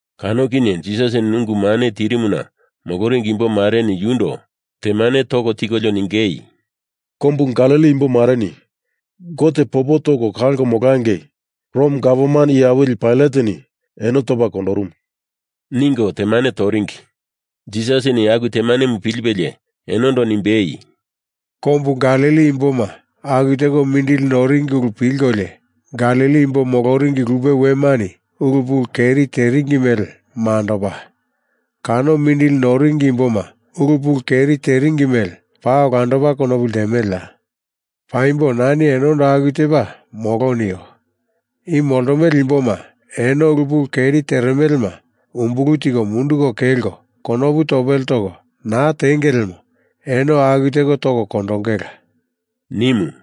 Kano kinye Jisasini ungu mane tirimuna moloringi imbo mareni yundo temane toko tikolio ningei, “Kombu Galili imbo mareni Gote popo toko kalko molangei Rom gavman iye awili Pailateni eno topa kondorumu,” ningo temane toringi. Jisasini aku temanemu pilipelie enondo nimbei, “Kombu Galili imboma aku teko mindili noringi ulu pilkolio Galili imbo moloringi lupe wemani ulu pulu keri teringi mele mandopa, kano mindili noringi imboma ulu pulu keri teringi mele paa olandopa konopu ltemeleya? Paimbo nani enondo aku tepa molo nio. I moltomele imboma, eno ulu pulu keri teremelema umbulu tiko munduko kelko konopu topele toko naa tenge lemo eno aku teko toko kondongela,” nimu.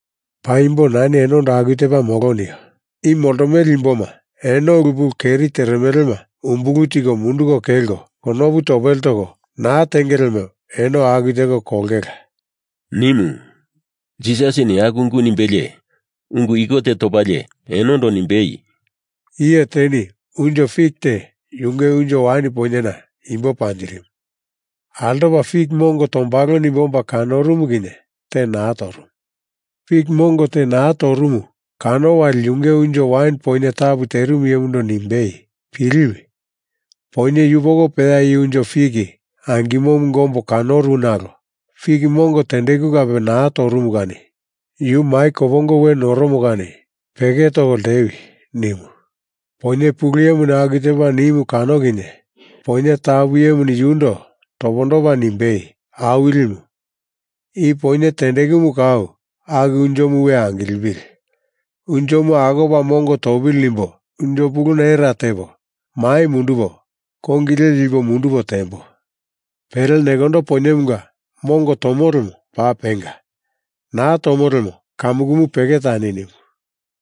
Paimbo nani enondo aku tepa molo nio. I moltomele imboma, eno ulu pulu keri teremelema umbulu tiko munduko kelko konopu topele toko naa tenge lemo eno aku teko kolongela,” nimu. Jisasini aku ungu nimbelie ungu iko te topalie enondo nimbei, “Iye teni unjo fik te yunge unjo wain poinyena imbo panjirimu. Altopa fik mongo tombalo nimbe omba kanorumu kinye te naa torumu. Fik mongo te naa torumu kano wali yunge unjo wain poinye tapu iyemundo nimbei, ‘Piliwi! Poinye yupoko peya i unjo fik angimomunga ombo kanoru nalo fik mongo tendeku kape naa torumu kani yu mai kopongo we noromo kani peke toko ltewi,’ nimu. Poinye pulu iyemu aku tepa nimu kano kinye poinye tapu iyemuni yundo topondopa nimbei, ‘Awilimu, i poinye tendekumu kau aku unjomu we angilipili! Unjomu akopa mongo topili nimbo unjo puluna era tepo mai mundupo kongi le lipo mundupo tembo. Pele nekondo poinyemunga mongo tomo lemo paa penga. Naa tomo lemo kamukumu peke tani,’ nimu,”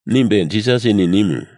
nimbe Jisasini nimu.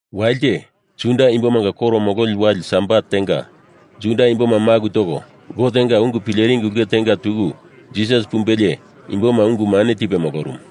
Walite, Juda Imbomanga koro mololi wale Sabat tenga Juda imboma maku toko Gotenga ungu pileringi ulke tenga tuku Jisas pumbelie imboma ungu mane tipe molorumu.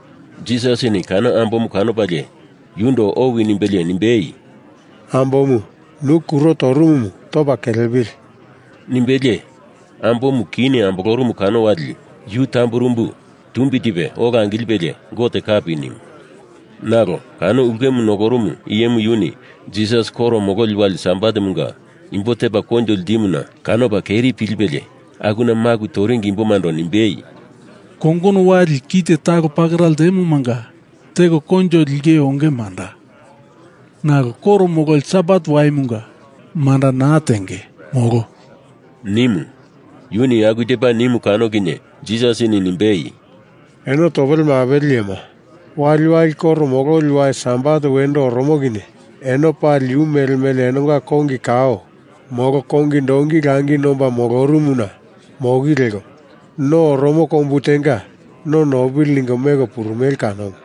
Jisasini kano ambomu kanopalie yundo owi nimbelie nimbei, “Ambomu, nu kuro torumumu topa kelepili!” nimbelie ambomu kini ambolorumu kano wali yu tamburumbu tumbi tipe ola angilipelie Gote kapi nimu. Nalo kano ulkemu nokorumu iyemu yuni Jisas koro mololi wali Sabatemunga imbo tepa koinjo ltimuna kanopa keri pilipelie akuna maku toringi imbomando nimbei, “Kongono wali ki te talo pakera ltemomanga teko koinjo lengei onge manda. Nalo koro mololi Sabat waimunga manda naa tenge, molo,” nimu. Yuni aku tepa nimu kano kinye Jisasini nimbei, “Eno topele mapele iyema. Waliwali koro mololi wali Sabat wendo oromo kinye eno pali yu mele mele enonga kongi kao molo kongi donki langi nomba molorumuna moki leko no oromo kombu tenga no nopili ningo meko purumele kanomu.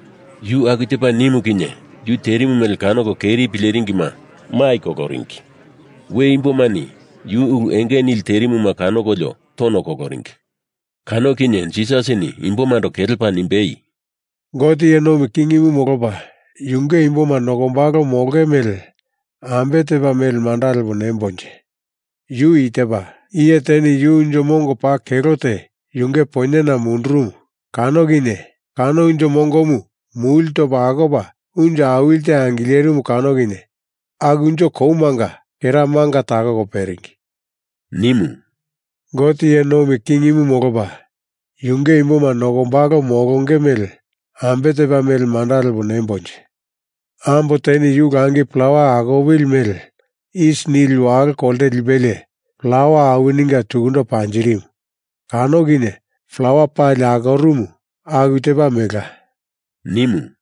Yu aku tepa nimu kinye yu terimu mele kanoko keri pileringima mai koloringi. We imbomani yu ulu enge nili terimuma kanokolio tono koloringi. Kano kinye Jisasini imbomando kelepa nimbei, “Gote iye nomi kingimu molopa yunge imboma nokombalo molonge mele ambe tepa mele manda lepo nembonje. Yu i tepa: Iye teni yu unjo mongo paa kelo te, yunge poinyena mundurumu kano kinye kano unjo mongomu muli topa akopa unjo awili te angilerimu kano kinye aku unjo komanga kera manga takoko peringi,” nimu. “Gote iye nomi kingimu molopa yunge imboma nokombalo molonge mele ambe tepa mele manda lepo nembonje? Ambo teni yu langi plawa akoli mele isi nili walo kolte lipelie plawa awininga tukundo panjirimu kano kinye plawa pali akorumu aku tepa melela,” nimu.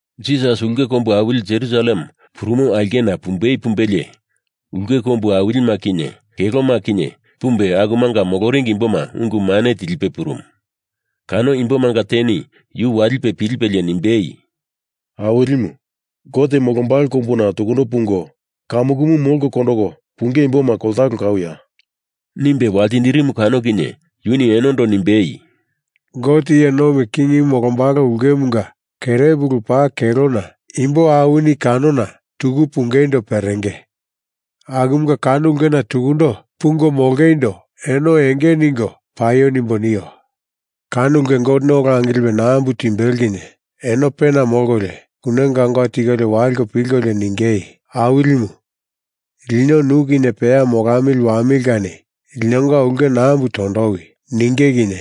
Jisas ulke kombu awili Jerusalem purumo aulkena pumbei pumbelie ulke kombu awilima kinye keloma kinye pumbe, akumanga moloringi imboma ungu mane tilipe purumu. Kano imbomanga teni yu walipe pilipelie nimbei, “Awilimu, Gote molombalo kombuna tukundo pungo kamukumu molko kondoko punge imboma koltalo kauya?” nimbe waltindirimu kano kinye yuni enondo nimbei, “Gote iye nomi kingimu molombalo ulkemunga kerepulu paa kelona imbo awini kanona tuku pungeindo perenge. Akumunga kano ulkena tukundo pungo molongeindo eno enge ningo paio nimbo nio. Kano ulke Goteni ola angilipe nambu timbelo kinye eno pena molkolio, kune gaungau tikolio waliko pilkolio ningei, ‘Awilimu, lino nu kinye peya molamili wamili kani linonga ulke nambu tondowi,’ ninge kinye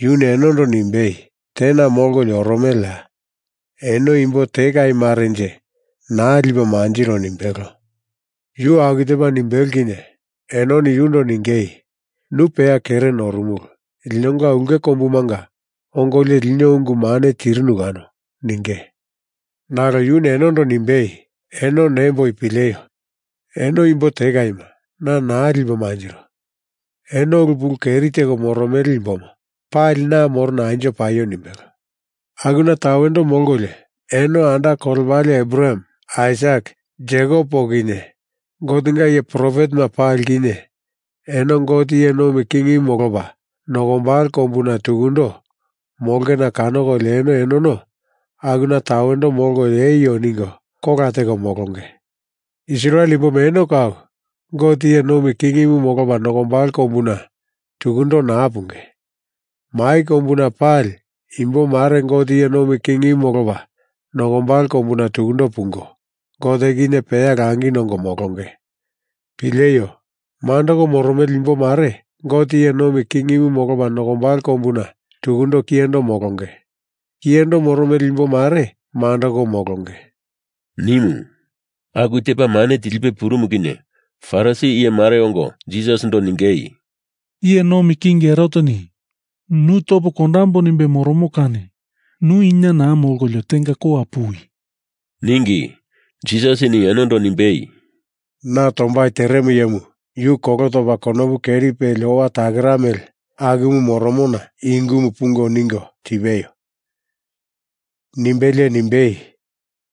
yuni enondo nimbei, ‘Tena molkolio oromeleya? Eno imbo tekai marenje naa lipo manjiro,’ nimbelo. Yuni aku tepa nimbelo kinye enoni yundo ningei, ‘Nu peya kere norumulu. Linonga ulke kombumanga ongolio lino ungu mane tirinu kano,’ ninge. Nalo yuni enondo nimbei, ‘Eno nemboi pileio! Eno imbo tekaima na naa lipo manjiro. Eno ulu pulu keri teko moromele imboma pali na morona anjo paio,’ nimbelo. Akuna tawendo molkolio eno anda kolepale Abraham, Aisak, Jekop poko kinye Gotenga iye profetema pali kinye, eno Gote iye nomi kingimu molopa nokombalo kombuna tukundo molongena kanokolio eno enono akuna tawendo molkolio eio ningo kola teko molonge. Israel imboma eno kau Gote iye nomi kingimu molopa nokombalo kombuna tukundo naa punge. Mai kombuna pali imbo mare Gote iye nomi kingimu molopa nokombalo kombuna tukundo pungo Gote kinye peya langi nongo molonge. Pileio! Mandoko moromele imbo mare Gote iye nomi kingimu molopa nokombalo kombuna tukundo kiyendo molonge. Kiyendo moromele imbo mare mandoko molonge,” nimu. Aku tepa mane tilipe purumu kinye Farisi iye mareni ongo Jisasindo ningei, “Iye Nomi King Heroteni nu topo kondambo nimbe moromo kani nu ina naa molkolio tenga kowa puwi!” ningi. Jisasini enondo nimbei, “Na tombai teremo iyemu, yu kolo topa konopu keri peli owa takera mele akumu moromona i ungumu pungo ningo tipeio!” nimbelie nimbei,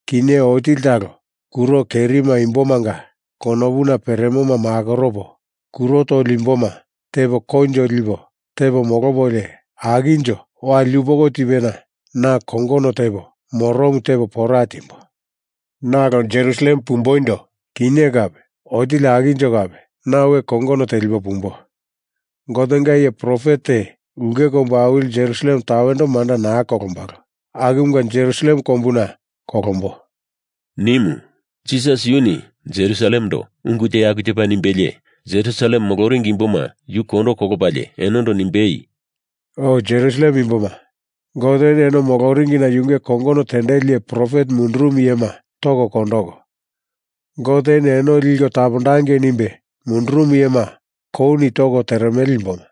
“Kinye otili talo kuro kerima imbomanga konopuna peremoma makoropo, kuro toli imboma tepo koinjo lipo tepo molopolio akinjo wali yupoko tipena na kongono tepo moromu tepo pora timbo. Nalo Jerusalem pumboindo kinye kape otili akinjo kape na we kongono telipo pumbo. Gotenga iye profet te ulke kombu awili Jerusalem tawendo manda naa kolombalo. Akumunga Jerusalem kombuna kolombo,” nimu. Jisas yuni Jerusalemendo ungu te aku tepa nimbelie Jerusalem moloringi imboma yu kondo kolopalie enondo nimbei, “O Jerusalem imboma, Goteni eno moloringina yunge kongono tendeli iye profet mundurumu iyema toko kondoko, Goteni eno Liko tapondangei nimbe mundurumu iyema kouni toko teremele imboma,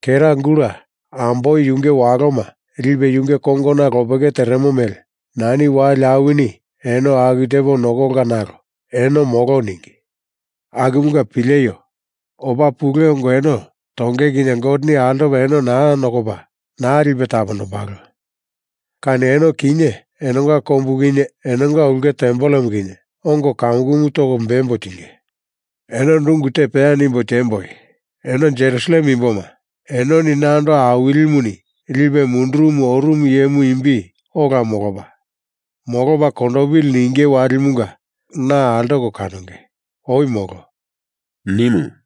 kera gula amboi yunge waloma lipe yunge kongona lopeke teremo mele nani wali awini eno aku tepo nokolka nalo eno molo ningi. Akumunga pileio! Opa pule ongo eno tonge kinye Goteni altopa eno naa nokopa naa lipe tapondombalo kani eno kinye enonga kombumu kinye enonga ulke tempelemu kinye ongo kamukumu toko bembo tinge. Enondo ungu te peya nimbo tiemboi! Eno Jerusalem imboma, enoni nando Awilimuni lipe mundurumu oromo iyemu imbi ola molopa, molopa kondopili ninge walimunga na altoko kanonge. Oi molo,” nimu.